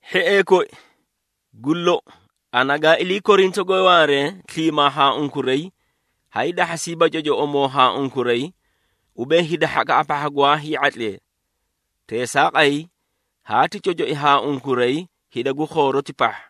Hhiee koi, gu lou, ana gaa ilii Korintoge waare sliimaa haa unkuray haay dahhasiiba cocoꞌomoo haa unkuray, ubee hida hhakaꞌa pahha gwaa hii⁄atlee. Teesaaqay, haati cocoi haa unkuray hida gu khooroti pahha,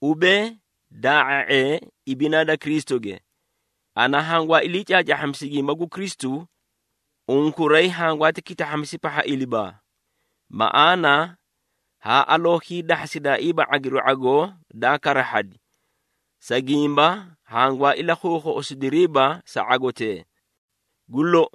ubee daa⁄a⁄ee ibinaa da Kristuge. Ana hangwaa ilii caacaahhamisi gimba gu Kristu, unkuray hangwaati kitahhamisi pahha ilibaa. Maꞌaana haa aloo hiidahhasidaaiiba ⁄agiru ⁄agoo daa karahhadi, sa gimba hangwaa ilakhuukhuꞌusidiriiba sa ⁄agotee. Gu lou,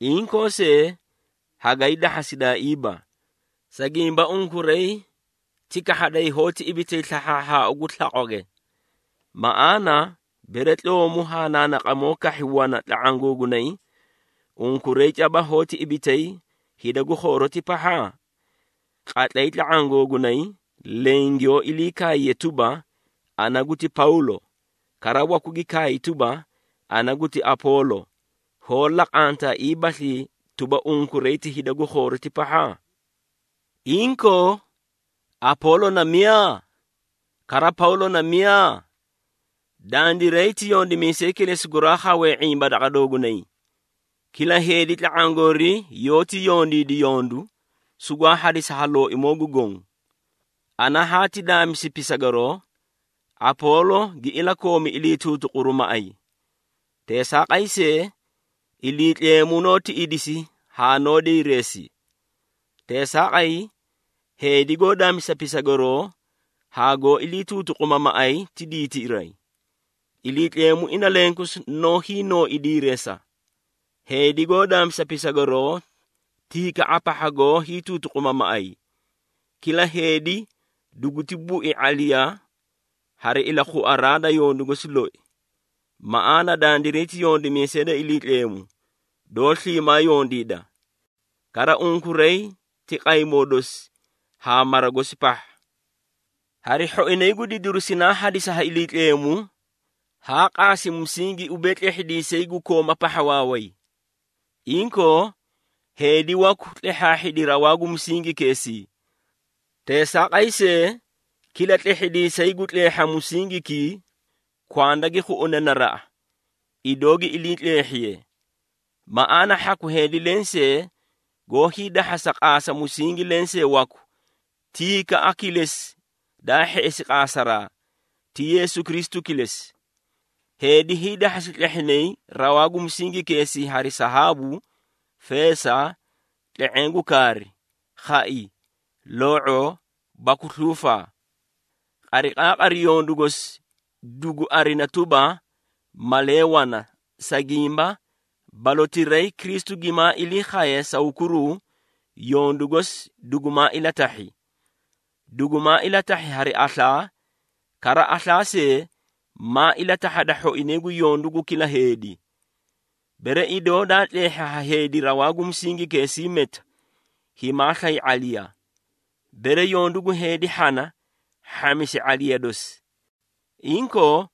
inkoo see hagay dahhasidaaiiba, sa gimba unkuray ti kahhaday hoóti ibitay slahhaahhaau gu slaqwage. Maꞌaana, bere tloomu haa naanaqamoo kahhi wana tla⁄aã googunay, unkuray caba hoóti ibitay hida gu khooroti pahha? Qatlay tla⁄aã googunay leẽ, giyoó ilii kaaye tuba, “Ana guti Pawlo,” kara waku gi kaay tuba, “Ana guti Apoolo,” hoó laqantaaiibaslii tuba, unkuray ti hida gu khooroti pahha? Inkoo, Apoolo na miyaa? Kara Pawlo na miyaa? Dandiray ti yondimiisee kilesi guraa khawee ⁄imba daqa doogunay. Kila heedi tla⁄aã goori yoóti yondiidi yondu, sugwaa hadisi ha Looimoo gu Goõ. Ana haati daamisi pisagaroo, Apoolo gi ilakoomi ilii tuutuquru maꞌay. Teesaaqay see, Iliitleemu noó tiꞌidisi haa noó diireesi. Teesaaqay, heedi goó daamisa pisagaroo haa goó ilii tuutuquma maꞌay ti diitiray. Iliitleemu ina lenkosi noó hiinooi diireesa. Heedi goó daamisa pisagaroo ti hikaꞌa pahha goó hiituutuquma maꞌay. Kila heedi duguti bui ⁄aliya, hari ilakhuaraa da yondu gosi loi. Maꞌaana dandiray ti yondimiisee da Iliitleemu, doó sliimaa yondiida. Kara unkuray ti qaymoo dosi haa mara gosi pahha. Hari hhoinay gu didiru sinaa hadisi ha Iliitleemu, haa qaasi musingi ubee tlehhidiisay gu kooma pahha waaway. Inkoo, heedi waku tleehhaahhidi rawaa gu musingikeesii. Teesaaqay see, kila tlehhidiisay gu tleehha musingikii, kwanda gi khuꞌune naraꞌa, idoo gi iliitleehhiye. Maꞌaana hhaku heedi lensee goó hiidahhasa qaasa musingi lensee waku, ti hikaꞌa kilesi daa hheꞌesi qaasaraa, ti Yeesu Kristu kilesi. Heedi hiidahhasi tleehhinay rawaa gu musingikeesii hari sahaabu, feesa, tle⁄eẽ gu kaari, khai, loo⁄oo baku sluufaa. Qariqaaqari yondu gosi dugu arina tuba, malee wana, sa gimba balotirayi Kristu gimaa ilii khaye sa hukuruu, yondu gosi dugumaa ilatahhi. Dugumaa ilatahhi hari aslaa, kara aslaa see, maa ilatahhada hhoinay gu yondu gu kila heedi. Bere idoo daa tleehhi ha heedi rawaa gu musingikeesii meta, himaa slay ⁄aliya. Bere yondu gu heedi hhana, hhamisi ⁄aliya dosi. Inkoo,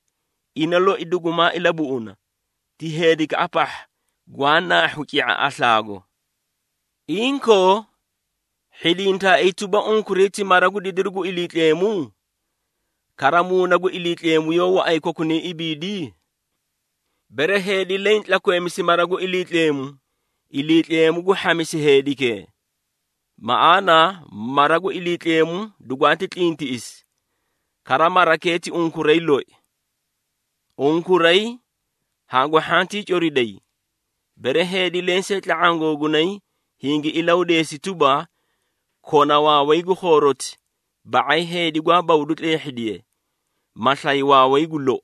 ina loi dugumaa ilabuꞌuna, ti heedikaꞌa pahha, gwaa naahhu ci⁄a aslaago. Inkoo, hhidintaaii tuba, unkuray ti mara gu didiru gu Iliitleemu? Kara, Muuna gu Iliitleemu yoó waꞌay kokunay ibiidii? Bere heedi leẽ tlakweemisi mara gu Iliitleemu, Iliitleemu gu hhamisi heedikee. Maꞌaana mara gu Iliitleemu dugwaati tlintiꞌisi, kara marakee ti unkuray loi. Unkuray hangu hhantii coriday. Bere heedi lensee tla⁄aã googunay hingi ilahudeesi tuba, kona waaway gu khooroti, ba⁄ay heedi gwaa bawdu tleehhidiye, ma slay waaway gu lou.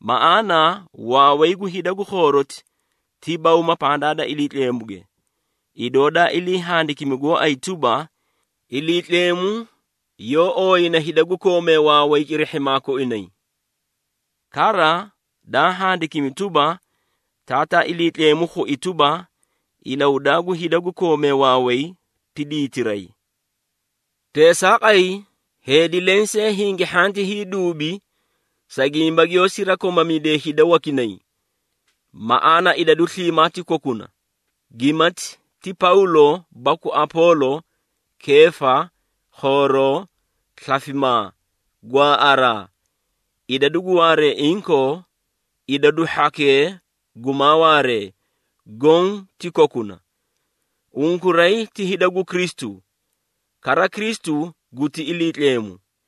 Maꞌaana waaway gu hida gu khooroti ti bawma pandaa da Iliitleemuge. Idoo daa ilii handikimi gooay tuba, “Iliitleemu yoó ooyina hida gu koomee waaway cirihhimaa koinay.” Kara daa handikimi tuba, “Taataa Iliitleemu khui tuba, ilahudaa gu hida gu koome waaway ti diitiray.” Teesaaqay, heedi lensee hingi hhanti hiiduubi, sa gimba giyoó sirakomamidiye hida wakinay. Maꞌaana idadu sliimaa ti kokuna, gimati ti Pawlo baku Apoolo, Keefa, khooroo, slafimaa, gwaaꞌaraa, idadu gu waaree inkoo, idadu hhakee gumaa waaree, goõ ti kokuna. Unkuray ti hida gu Kristu, kara Kristu guti Iliitleemu.